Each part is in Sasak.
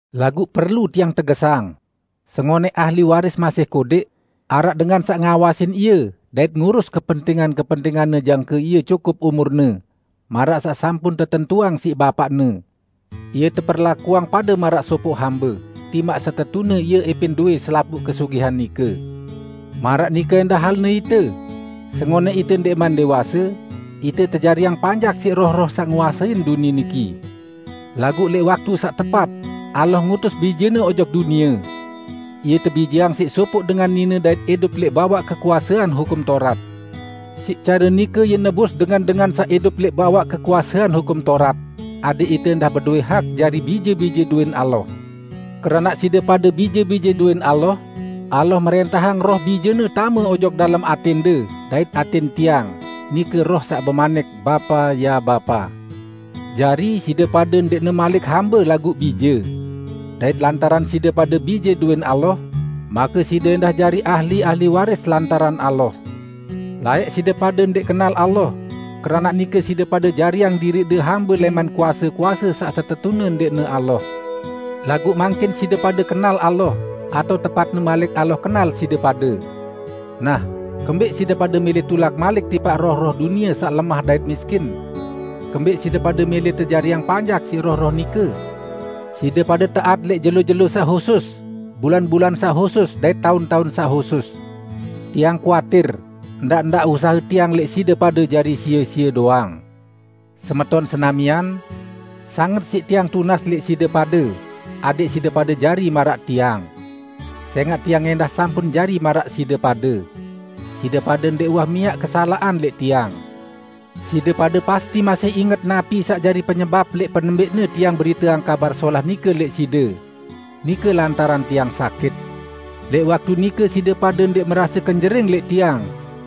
Laguq perlu tiang tegesang: Sengonẽq ahli waris masih kodẽq, araq dengan saq ngawasin ie dait ngurus kepentingan-kepentinganne jangke ie cukup umurne, maraq saq sampun tetentuang siq bapaqne. Ie teperlakuang pade maraq sopoq hambe, timaq setetune ie ẽpẽn dowẽ selapuq kesugihan nike. Maraq nike ẽndah halne ite: Sengonẽq ite ndẽqman dẽwase, ite tejariang panjak siq roh-roh saq nguasein dunie niki. Laguq lẽq waktu saq tepat, Allah ngutus Bije-Ne ojok dunie. Ie tebijeang siq sopoq dengan nine dait idup lẽq bawaq kekuasean Hukum Taurat. Siq care nike Ie nebus dengan-dengan saq idup lẽq bawaq kekuasean Hukum Taurat; adẽq ite ẽndah bedowẽ hak jari bije-bije dowẽn Allah. Keranaq side pade bije-bije dowẽn Allah, Allah mrẽntahang Roh Bije-Ne tame ojok dalem atẽnde dait atẽn tiang, nike Roh saq bemanik, "Bapa, ya Bapa." Jari, side pade ndẽqne malik hambe, laguq bije. Dait lantaran side pade bije dowẽn Allah, make side ẽndah jari ahli-ahli waris lantaran Allah. Laẽq side pade ndẽq kenal Allah, keranaq nike side pade jariang diriqde hambe lẽman kuase-kuase saq setetune ndẽqne Allah. Laguq mangkin side pade kenal Allah, atao tepatne malik Allah kenal side pade. Nah, kembẽq side pade mẽlẽ tulak malik tipaq roh-roh dunie saq lemah dait miskin? Kembẽq side pade mẽlẽ tejariang panjak siq roh-roh nike? Side pade taat lẽq jelo-jelo saq husus, bulan-bulan saq husus, dait taun-taun saq husus. Tiang kuatir, ndaq-ndaq usahe tiang lẽq side pade jari sie-sie doang. Semeton senamian! Sanget siq tiang tunas lẽq side pade adẽq side pade jari maraq tiang. Sẽngaq tiang ẽndah sampun jari maraq side pade. Side pade ndẽq uwah miaq kesalaqan lẽq tiang. Side pade pasti masih inget napi saq jari penyebap lẽq penembẽqne tiang beriteang Kabar Solah nike lẽq side. Nike lantaran tiang sakit. Lẽq waktu nike side pade ndẽq merase kenjering lẽq tiang,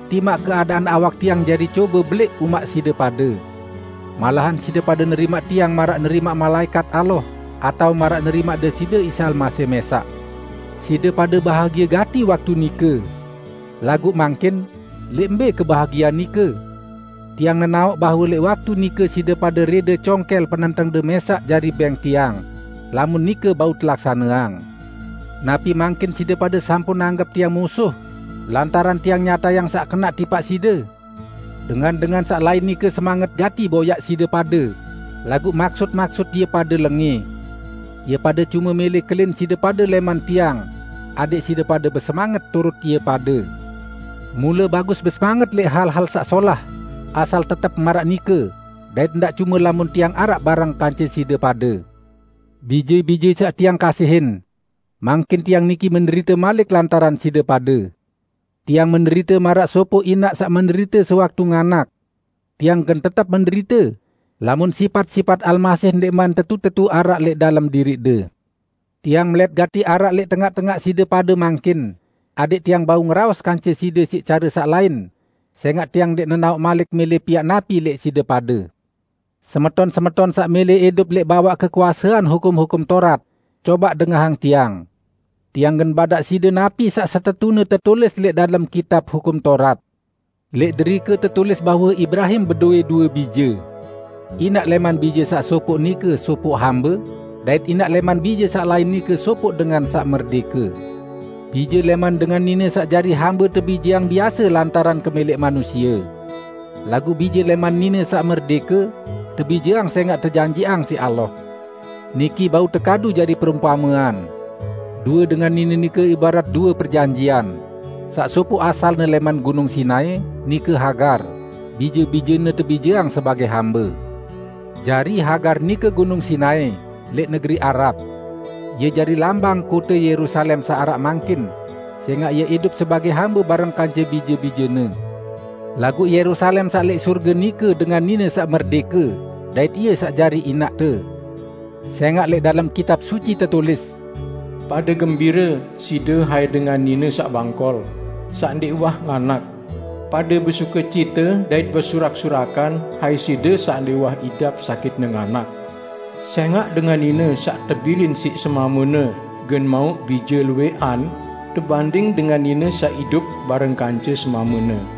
timaq keadaan awak tiang jari cobe belẽq umaq side pade. Malahan side pade nerimaq tiang maraq nerimaq malaẽkat Allah atao maraq nerimaq Deside Isa Almasih mẽsaq. Side pade bahagie gati waktu nike. Laguq mangkin, lẽq mbẽ kebahagiean nike? Tiang nenaoq bahwe lẽq waktu nike side pade rẽde congkẽl penentengde mẽsaq jari bẽng tiang, lamun nike bau telaksaneang. Napi mangkin side pade sampun anggep tiang musuh, lantaran tiang nyatayang saq kenaq tipaq side? Dengan-dengan saq lain nike semanget gati boyaq side pade, laguq maksut-maksut ie pade lengẽ. Ie pade cume mẽlẽ kelin side pade lẽman tiang, adẽq side pade besemanget turut ie pade. Mule bagus besemanget lẽq hal-hal saq solah, asal tetep maraq nike, dait ndaq cume lamun tiang araq bareng kance side pade. Bije-bije tiang saq tiang kasihin! Mangkin tiang niki menderite malik lantaran side pade. Tiang menderite maraq sopoq inaq saq menderite sewaktu nganak. Tiang gen tetep menderite, lamun sipat-sipat Almasih ndẽqman tetu-tetu araq lẽq dalem diriqde! Tiang melẽt gati araq lẽq tengaq-tengaq side pade mangkin, adẽq tiang bau ngeraos kance side siq care saq lain, sẽngaq tiang ndẽq nenaoq malik mẽlẽ piaq napi lẽq side pade! Semeton-semeton saq mẽlẽ idup lẽq bawaq kekuasean Hukum-hukum Taurat, cobaq dengahang tiang! Tiang gen badaq side napi saq setetune tetulis lẽq dalem kitab Hukum Taurat. Lẽq derike tetulis bahwe Ibrahim bedowẽ due bije: Inaq lẽman bije saq sopoq nike sopoq hambe, dait inaq lẽman bije saq lain nike sopoq dengan saq merdẽke. Bije lẽman dengan nine saq jari hambe tebijeang biase lantaran kemẽlẽq manusie. Laguq bije lẽman nine saq merdẽke, tebijeang sẽngaq tejanjiqang siq Allah. Niki bau tekadu jari perumpamean. Due dengan nine nike ibarat due perjanjian: Saq sopoq asalne lẽman Gunung Sinai -- nike Hagar; bije-bijene tebijeang sebagẽ hambe. Jari, Hagar nike Gunung Sinai, lẽq negeri Arab. Ie jari lambang kote Yerusalem saq araq mangkin, sẽngaq ie idup sebagẽ hambe bareng kance bije-bijene. Laguq Yerusalem saq lẽq sorge nike dengan nine saq merdẽke, dait ie saq jari inaqte. Sẽngaq lẽq dalem Kitab Suci tetulis, "Pade gembire side hai dengan nine saq bangkol, saq ndẽq uwah nganak! Pade besukecite dait besurak-surakan hai side saq ndẽq uwah idap sakitne nganak! Sẽngaq dengan nine saq tebilin siq semamene gen mauq bije luwẽqan tebanding dengan nine saq idup bareng kance semamene."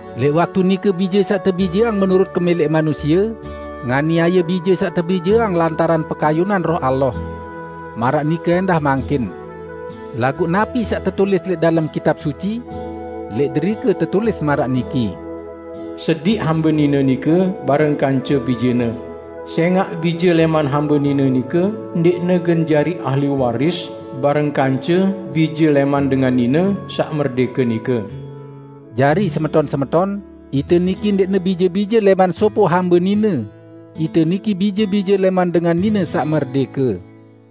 Lẽq waktu nike bije saq tebijeang menurut kemẽlẽq manusie, nganiaye bije saq tebijeang lantaran pekayunan Roh Allah. Maraq nike ẽndah mangkin. Laguq napi saq tetulis lẽq dalem Kitab Suci? Lẽq derike tetulis maraq niki: "Sediq hambe nine nike bareng kance bijene, sẽngaq bije lẽman hambe nine nike ndẽqne gen jari ahli waris bareng kance bije lẽman dengan nine saq merdẽke nike." Jari, semeton-semeton, ite niki ndẽqne bije-bije lẽman sopoq hambe nine; ite niki bije-bije lẽman dengan nine saq merdẽke.